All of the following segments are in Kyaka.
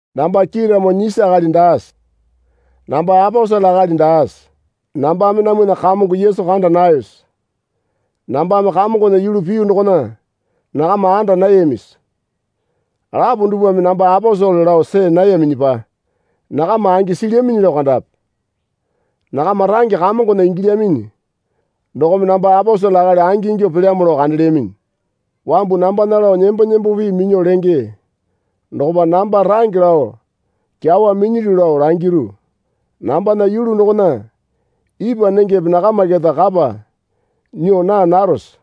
Namba kiiramo nyisi akali daase? Namba aposele akali daase? Nambame namwana Kamongo Yesu kanda nayose? Nambame Kamongona yulu piyu dokona nakama anda nayamisi? Lapo dupwame namba aposele lao see nayaminyipa nakama angi silyaminyi lao kandape. Nakama range Kamongona ingilyaminyi dokome namba aposele akali angingyuo pelyamo lao kandelyaminyi. Wambu nambana lao nembo nembo pii minyuo lenge dokopa namba range lao kyawa minyilyu lao langiru. Nambana yulu dokona ipwa nengepe nakama keta kapa nyuo naa narose?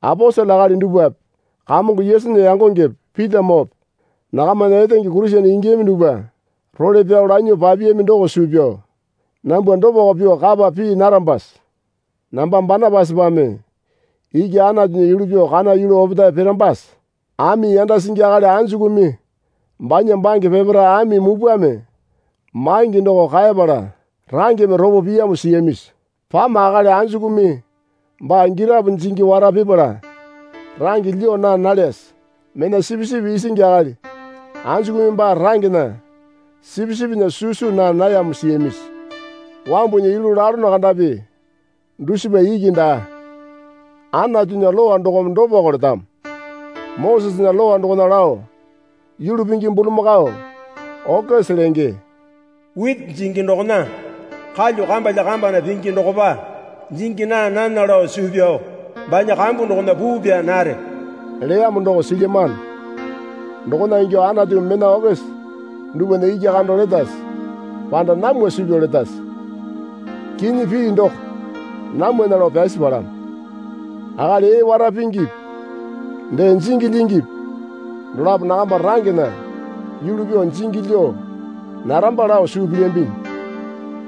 Aposele akali dupwape Kamongo Yesunya yangongepe Pitamoope nakamana etenge Kurisene ingiyami dupwa role pyao lanyuo papiyami doko suu pyao nambwa dopako pyuo kapa pii narambase? Namba Banapasapame iki Anatunya yulu pyuo kana yulu opetae pirambase? Ami yanda singi akali anjukumi banya bange peparae ami mupwame maingi doko kaepala rangeme ropo piyamo siyamisi? Pama akali anjukumi baa girapo jingi wara pipala range lyuo naa nalyase? Mena sipisipi isingi akali anjukumi baa rangena sipisipinya susu naa nayamo siyamisi? Wambunya yulu lalono kandapi dusipa iki daa. Anatunya Lowa dokome dopako letamo. Mosesena Lowa dokona lao yulu pingi bulamakao (okese lenge), witi jingi dokona kalyuo kambalya kambana pingi dokopa jingi naa nana lao suu pyao banya kambu dokona puu pyaa nare leyamo doko silyamano. Dokona ingyuo Anatumi mena okese dupwana iki kando letase? Panda namwa suu pyao letase? Kinyi pii doko namwana lao pyasi palamo. Akali ee wara pingipi dee jingi lyingipi dolapo nakama rangena yulu pyuo jingi lyuo naramba lao suu pilyambinyi.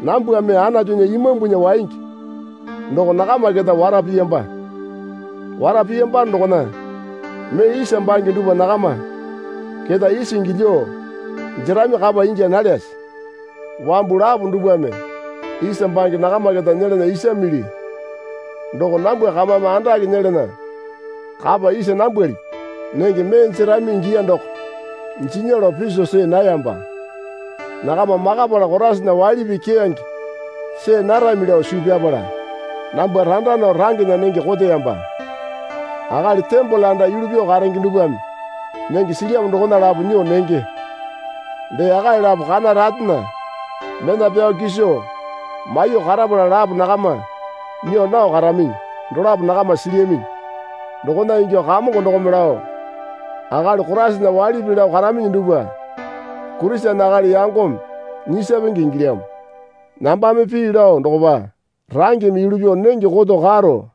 Nambwame Anatunya Imambunya waingi doko nakama keta wara piyamba. Wara piyambano dokona mee isa bange dupwa nakama keta isingi lyuo jerami kapa ingya nalyase? Wambu lapo dupwame isa bange nakama keta nyelana isamili doko nambwa kamame andake nyelana kapa isa nambwalipi? Nenge mee jerami ingiya doko jinya lao piso see nayamba. Nakama makapala Koraisana waili pii keyange see narami lao suu pyapala nambwa randa nao rangena nenge koteyamba. Akali tembole anda yulu pyuo karenge dupwame nenge silyamo dokona lapo nyuo nenge. Dee akali lapo kana ratena mena pyao kiso maiyuo karapala lapo nakama nyuo nao karaminyi dolapo nakama silyaminyi. Dokona ingyuo Kamongo dokome lao akali Koraisana waili pii lao karaminyi dupwa Kurisene akali yangome nyisapenge ingilyamo. Nambame pii lao dokopa rangeme yulu pyuo nenge koto karo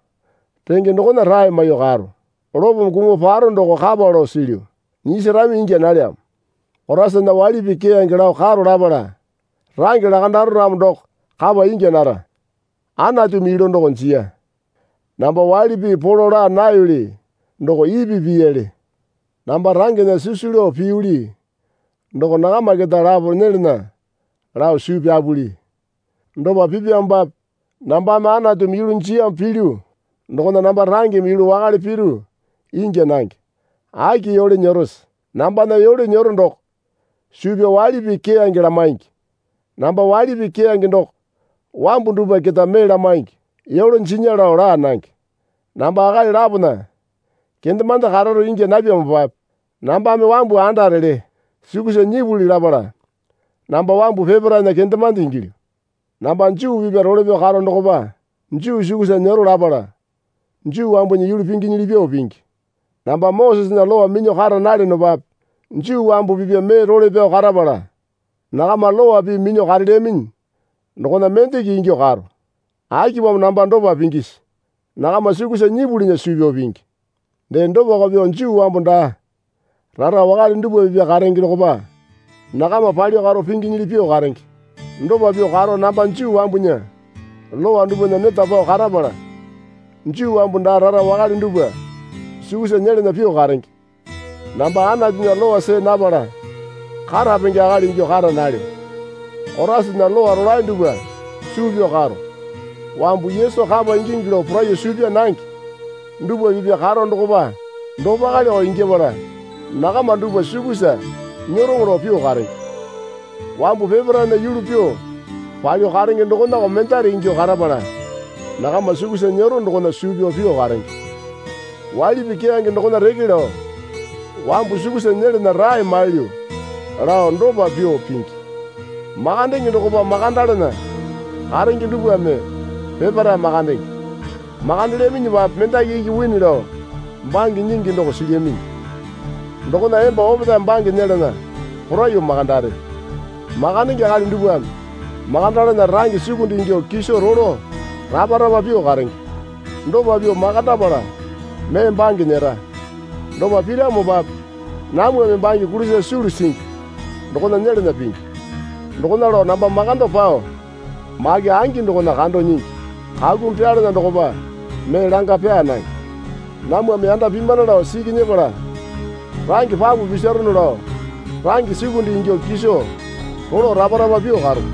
renge dokona rae maiyuo karo. Lopome kumuo paro doko kapa lao silyu. Nyisarami ingya nalyamo. Koraisana waili pii keyange lao karo lapala range lakandaro ramo doko kapa ingya nara. Anatumi yulu doko jiya. Namba waili pii polo laa nayoli doko ipi piyali. Namba rangena sisu lao piyuli doko nakama keta lapo nyelana lao suu pyapuli. Dopa pipyamopape nambame Anatumi yulu jiyamo pilyu dokona namba rangeme yulu wakale piru ingya nange. Aki yole nyerose? Nambana yole nyero doko suu pyao waili pii keyange lamaingi. Namba waili pii keyange doko wambu dupwa keta mee lamaingi. Yole jinya lao laa nange. Namba akali lapona kendemande kararo ingya napyamopape nambame wambu andarele sukusa nyipuli lapala namba wambu peparaena kendemande ingilyu. Namba Juu pipya role pyao karo dokopa Juu sukusa nyero lapala Juu wambunya yulu pinginyili pyuo pingi. Namba Mosesena Lowa minyuo kara nalyonopape Juu wambu pipya mee role pyao karapala nakama lowa pii minyuo karelyaminyi dokona mendeko ingyuo karo. Akipamo namba dopa pingisi? Nakama sukusa nyipulinya suu pyao pingi. Dee dopako pyuo Juu wambu daa rara wakale dupwa pipya karenge dokopa nakama palyuo karo pinginyili pyuo karenge. Dopa pyuo karo namba Juu wambunya Lowa dupwana neta pao karapala Juu wambu daa rara wakale dupwa sukusa nyelana pyuo karenge. Namba Anatunya lowa see napala karapenge akali ingyuo kara nalyo. Koraisana lowa rolae dupwa suu pyao karo. Wambu Yesu kapa ingingi lao poraiyuo suu pyaa nange dupwa pipya karo dokopa dopaleyoko igyapala nakama dupwa sukusa nyeroŋo lao pyuo karenge. Wambu peparaena yulu pyuo palyuo karenge dokonako mendare ingyuo karapala nakama sukusa nyero dokona suu pyao pyuo karenge. Waili pii keyange dokona reke lao wambu sukusa nyelana rae mailyu lao dopa pyuo pingi. Makandenge dokopa makandalana karenge dupwame peparae makandenge. Makandelyaminyipape mendaki iki wini lao bange nyingi doko silyaminyi. Dokona emba opetae bange nyelana poraiyuo makandare. Makandenge akali dupwame makandalana range sukunde ingyuo kiso rolo rapa rapa pyuo karenge. Dopa pyuo makandapala mee bange nyera. Dopa piramopape namwame bange kulisa sulu singi dokona nyelana pingi. Dokona lao namba makando pao make angi dokona kando nyingi. Kakumi pyalana dokopa mee langa pyaa nange. Namwame yanda pimana lao siki nyepala range papu pisarono lao range sukunde ingyuo kiso rolo rapa rapa pyuo karo.